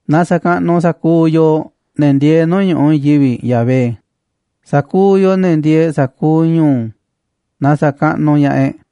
Na sa̱kaꞌnuꞌ sa̱kuuꞌ yooꞌ, ne̱ ndieeꞌ nuu̱ꞌ ñu̱ꞌuꞌ i̱i̱n yivi̱ꞌ, Yahvé, sa̱kuuꞌ yooꞌ, ne̱ ndieeꞌ sa̱kuuꞌ ñu̱u̱, na sa̱kaꞌnuꞌ ña̱ꞌaꞌ e̱ꞌ.